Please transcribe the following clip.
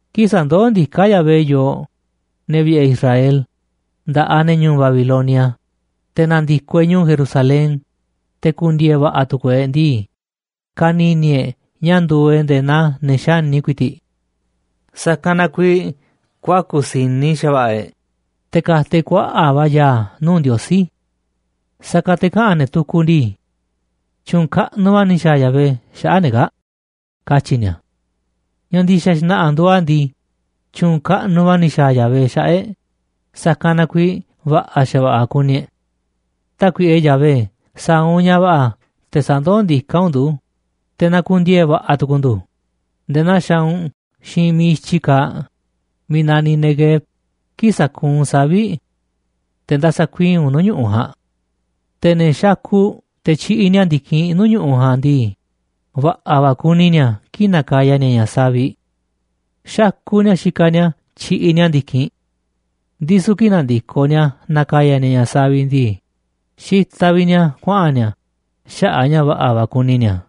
Kii̱ꞌ sa̱ndoó ndiká Yahvé yooꞌ, ne̱ vi̱ꞌe̱ Israel, nda̱ꞌaꞌ ne̱ ñu̱u̱ Babilonia, te̱ na̱ndi̱koꞌ e̱ꞌ ñu̱u̱ Jerusalén, te̱ na̱ku̱ndiee̱ va̱ꞌa̱ tu̱ku̱u̱ e̱ꞌ ndii, ka̱ni̱ni̱ e̱ꞌ ña̱ nduuꞌ e̱ꞌ nde̱e̱ naa ne̱ xáni ku̱i̱ti̱ꞌ. Sa̱kanꞌ na kuiiꞌ kuaku̱ si̱ni xa̱va̱ꞌa̱ e̱ꞌ, te̱ ka̱ta̱ e̱ꞌ kuaꞌa̱ꞌ va̱ ya̱a̱ nuu̱ꞌ Ndiosí. Sa̱kanꞌ te̱ kaꞌa̱n ne̱ tukuꞌ ndii: “Tyu̱u̱n kaꞌnuꞌ va̱ ni̱ xa̱a̱ Yahvé xaꞌa̱ꞌ ne̱ kaa̱ꞌ”, katyi̱ ni̱a̱. Ña̱ ndi̱xa̱ xna̱ꞌa̱ nduuꞌ a̱ ndii, tyu̱u̱n kaꞌnuꞌ va̱ ni̱ xa̱a̱ Yahvé xaꞌa̱ꞌ e̱ꞌ, sa̱kanꞌ na kuiiꞌ va̱ꞌa̱ xa̱va̱ꞌa̱ kuni e̱ꞌ. Tákuiꞌe Yahvé, sa̱a̱ u̱nꞌ ña̱ va̱ꞌa̱ te̱ sa̱ndoó ndiká u̱nꞌ ndu̱, te̱ na̱ku̱ndiee̱ va̱ꞌa̱ tu̱ku̱u̱ ndu̱ nde̱e̱ naa xaaꞌ u̱nꞌ xiinꞌ miiꞌ i̱tyi kaaꞌ, miiꞌ naniꞌ Neguev, kii̱ꞌ sakuunꞌ u̱nꞌ savi̱ꞌ te̱ nda̱sa̱ kuii̱ꞌ u̱nꞌ nuu̱ꞌ ñu̱ꞌuꞌ ja̱a̱nꞌ. Te̱ ne̱ xakuꞌ te̱ tyiꞌiꞌ ni̱a̱ ndi̱kinꞌ nuu̱ꞌ ñu̱ꞌuꞌ ja̱a̱nꞌ ndii, va̱ꞌa̱ va̱ kuni ni̱a̱ kii̱ꞌ na̱ka̱ya̱ ni̱a̱ ña̱ saviꞌ. Xakuꞌ ni̱a̱ kii̱ꞌ xikaꞌ ni̱a̱ tyiꞌiꞌ ni̱a̱ ndi̱kinꞌ, ndisu̱ kii̱ꞌ na̱ndi̱koꞌ ni̱a̱ na̱ka̱ya̱ ni̱a̱ ña̱ saviꞌ ndii, xitaꞌ vi̱ꞌ ni̱a̱ kuaꞌa̱n ni̱a̱ xaꞌa̱ꞌ a̱ ña̱ va̱ꞌa̱ va̱ kuni ni̱a̱.